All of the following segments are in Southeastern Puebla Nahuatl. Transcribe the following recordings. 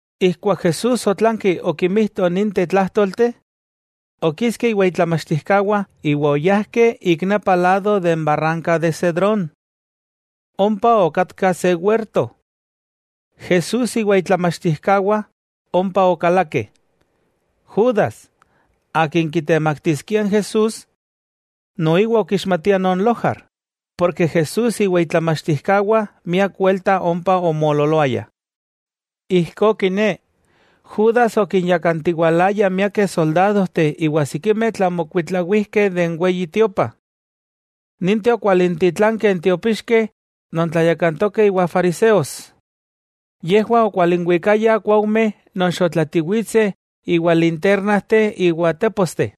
Ijkuak Jesús otlanki okimijto ninteh tlájtolteh, okiski iwa itlamachtijkawah iwa oyajkeh ik nepa lado de n barranka de Cedrón. Ompa okatka se werto, Jesús iwa itlamachtijkawah ompa okalakeh. Judas, akin kitemaktiskia n Jesús, noiwa okixmatia non lojar, porke Jesús iwa itlamachtijkawah miak welta ompa omoololoayah. Ijkó kiné, Judas okinyakantiwalaya miakeh soldadojteh iwa sikimeh tlamokuitlawijkeh de n Weyi Tiopa. Ninteh okwalintitlankeh n tiopixkeh non tlayakantokeh iwa fariseos. Yejwah okwalinwikayah kuaujmeh non xotlatiwitseh iwa lintérnajteh iwa téposteh.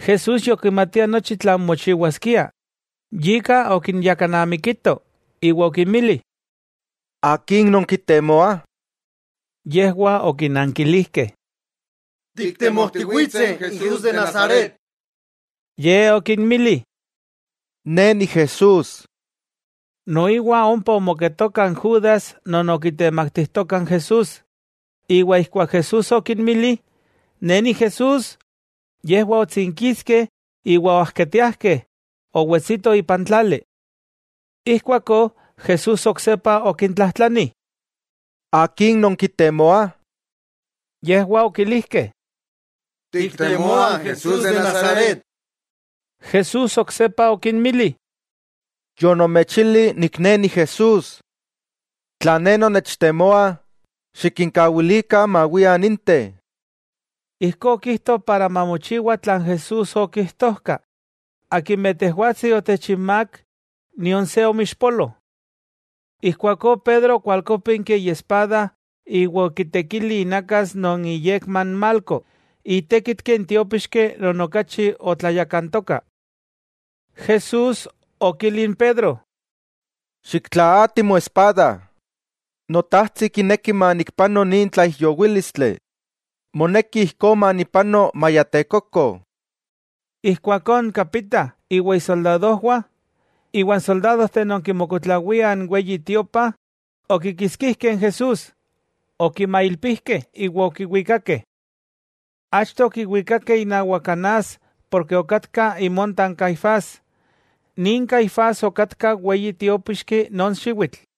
Jesús yokimatia nochi tlan mochiwaskia, yika okinyakanamikito iwa okinmili: —¿Akin nonkitemoah? Yejwah okinankilijkeh: —Tiktemojtiwitseh n Jesús de Nazaret. Ye okinmili: —Ne Ni Jesús. Noiwa ompa omoketoka n Judas non okitemaktijtoka n Jesús. Ijkuak Jesús okinmili: “Ne Ni Jesús”, yejwah otsinkiskeh iwa oajketiajkeh owetsito ipan tlali. Ijkuakó Jesús oksepa okintlajtlani: —¿Akin nonkitemoah? Yejwah okilijkeh: —Tiktemoah n Jesús de Nazaret. Jesús oksepa okinmili: —Yonomechili Ne Ni Jesús. Tla Ne nonnechtemoah, xikinkawilikah mawiah ninteh. Ijkó okijto para mamochiwa tlan Jesús okijtojka: “Akimeh Tejwatsi otechinmák, nion se omoixpolo.” Ijkuakó Pedro okwalkópinki iespada iwa okitekili inakas non iyekma n Malco, itékitki n tiópixki non okachi otlayakantoka. Jesús okili n Pedro: —¡Xiktlaati moespada! Notajtsi kineki manikpano nin tlaijyowílistli, moneki ijkó manipano maya tekoko. Ijkuakó n kapita, iwa isoldadojwah, iwa n soldádojteh non kimokuitlawiah n Weyi Tiopa, okikitskijkeh n Jesús, okimailpijkeh iwa okiwikakeh. Achto okiwikakeh inawak Anás porke okatka imonta n Caifás. Nin Caifás okatka weyi tiópixki non xiwitl.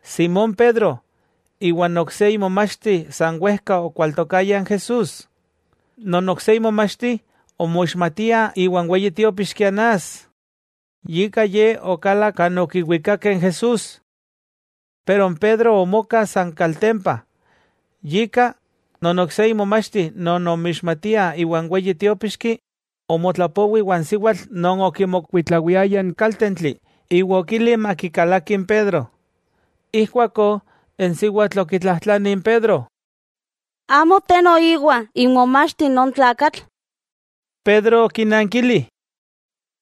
Simón Pedro iwa n ok se imomachti san wejka okwaltokayah n Jesús. Non ok se imomachti omoixmatia iwa n weyi tiópixki Anás, yika ye okalak kan okiwikakeh n Jesús. Pero n Pedro omoka san kaltempa. Yika, non ok se imomachti non omixmatia iwan weyi tiópixki, omotlapowi iwan siwatl non okimokuitlawiaya n kaltentli iwa okili makikalaki n Pedro. Ijkuakó n siwatl okitlajtlani n Pedro: —¿Amo te noiwa imomachti non tlakatl? Pedro okinankili: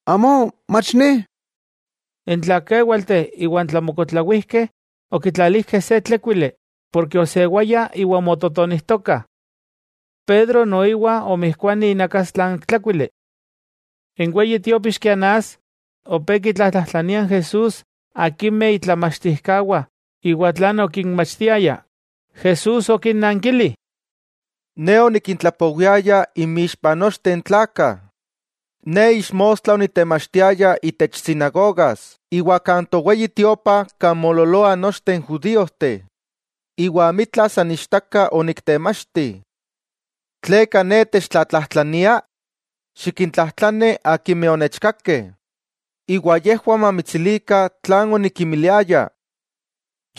—Amó, mach ne. N tlakewalteh iwa n tlamokuitlawijkeh okitlalijkeh se tlékuili porke osewaya, iwa omototonijtokah. Pedro noiwa omijkuani inakastla n tlékuili. N weyi tiópixki Anás, opé kitlatsintokia Jesús akimeh itlamachtijkawah iwa tlan okinmachtiaya. Jesús okinankili: —Ne onikintlapowiaya inmixpa nochteh n tlakah. Ne ixmostla onitemachtiaya itech sinagogas iwa kan toweyi Tiopa kan moololoah nochteh n judíojteh, iwa amitla san ichtaka oniktemachti. ¿Tleka Ne techtlatlajtlania? Xikintlajtlani akimeh onechkakeh, iwa yejwah mamitsilikah tlan onikinmiliaya.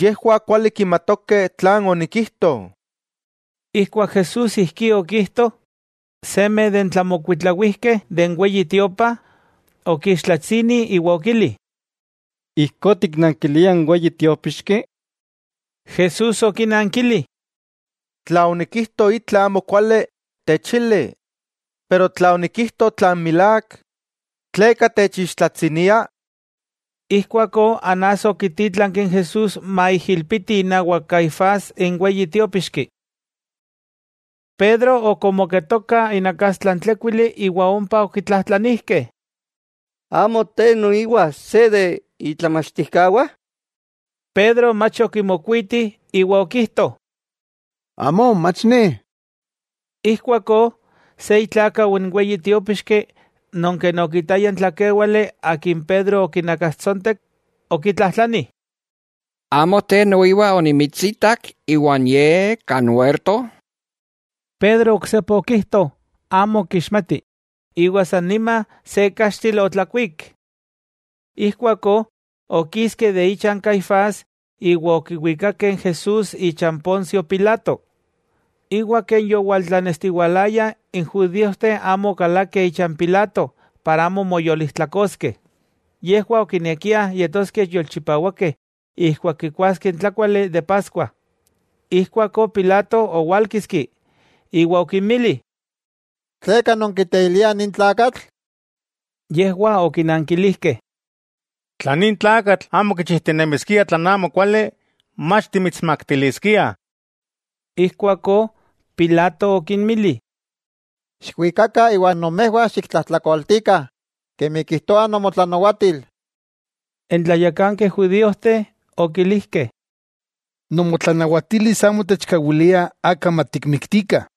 Yejwah kuali kimatokeh tlan onikijto. Ijkuak Jesús ijkí okijto, se non kimokuitlawia de n Weyi Tiopa, okiixtlatsini iwa okili: —¿Ijkó tiknankilia n weyi tiópixki? Jesús okinankili: —Tla onikijto itla amokuali, techili. Pero tla onikijto tlan milák, ¿tleka techixtlatsinia? Ijkuakó Anás okitítlanki n Jesús maijilpiti inawak Caifás n weyi tiópixki. Pedro ok omoketoka inakastla n tlékuili iwa ompa okitlajtlanijkeh: —¿Amo te noiwa se de itlamachtijkawah? Pedro mach okimokuiti, iwa okijto: —Amó, mach ne. Ijkuakó se itlákau n weyi tiópixki non ken okitaya n tlakéwale akin Pedro okinakastsontek, okitlajtlani: —¿Amo te noiwa onimitsitak iwan Ye, kan werto? Pedro oksepa okijto amo kixmati, iwa san nima se kaxtil otlakuík. Ijkuakó okiskeh icha n Caifás iwa okiwikakeh n Jesús ichan Poncio Pilato. Iwa ken yotlanestiwalaya n judíojteh amo okalakeh icha n Pilato para amo moyolijtlakoskeh. Yejwah okinekiah yetoskeh yolchipawakeh ijkuak kikuaskeh n tlákuali de Paskua. Ijkuakó Pilato owálkiski, iwa okinmili: —¿Tleka nonkiteiliah nin tlakatl? Yejwah okinankilijkeh: —Tla nin tlakatl amo kichijtinemiskia tlan amokuali, mach timitsmaktiliskiah. Ijkuakó Pilato okinmili: —Xikwikakah iwa nomejwah xiktlajtlakoltikah kemi kijtoa nomotlanawatil. N tlayakankeh judíojteh okilijkeh: —Nomotlanawatilis amo techkawilia aka matikmiktikah.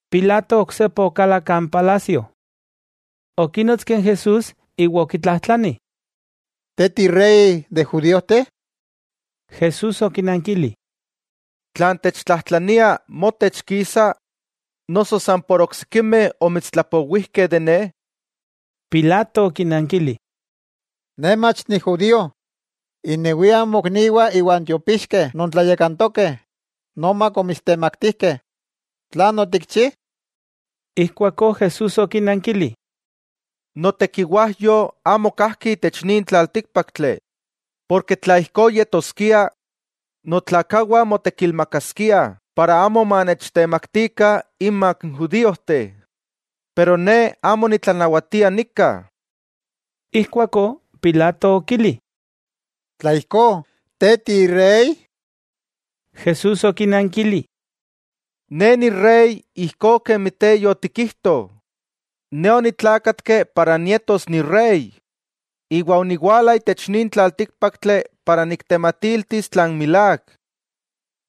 Pilato oksepa okalak kan palasio. Okínotski n Jesús iwa okitlajtlani: —¿Te tirey de judíojteh? Jesús okinankili: —¿Tlan techtlajtlania, motech kisa, noso san por oksikimeh omitstlapowijkeh de Ne? Pilato okinankili: —¡Ne mach ni judío! Innewiah mokniwah iwa n tiopixkeh non tlayakantokeh nomak omitstemaktijkeh. ¿Tlan otikchi? Ijkuakó Jesús okinankili: —Notekiwajyo amo kajki itech nin tlaltíkpaktli. Porke tla ijkó yetoskia, notlakawah motekilmakaskiah para amo manechtemaktikah inmak n judíojteh. Pero Ne amo nitlanawatia nika. Ijkuakó Pilato okili: —Tla ijkó, ¿te tirey? Jesús okinankili: —Ne Ni Rey ijkó kemi te yotikijto. Ne onitlákatki para nietos Ni Rey iwa oniwala itech nin tlaltíkpaktli para niktematiltis tlan milák.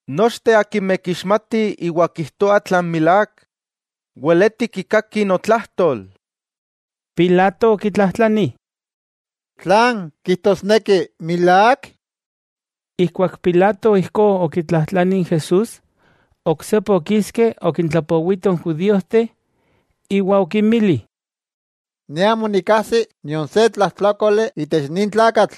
Nochteh akimeh kixmatih iwa kijtoah tlan milák, weleti kikakih notlajtol. Pilato okitlajtlani: —¿Tlan kijtosneki milák? Ijkuak Pilato ijkó okitlajtlani n Jesús, oksepa okiski okintlapowito n judíojteh, iwa okinmili: —Ne amo nikkajsi nion se tlajtlákoli itech nin tlakatl.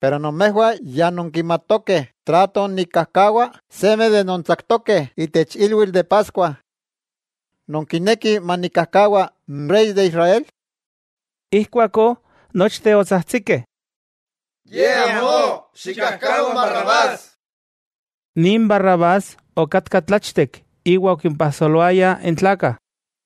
Pero nomejwah ya nonkimatokeh trato nikkajkawa seme de nontsaktokeh itech ilwitl de Paskua. ¿Nonkinekih manikkajkawa n Rey de Israel? Ijkuakó, nochteh otsajtsikeh: —¡Ye amó! ¡Xikkajkawa n Barrabás! Nin Barrabás okatka tlachtek iwa okimpajsoloaya n tlakah.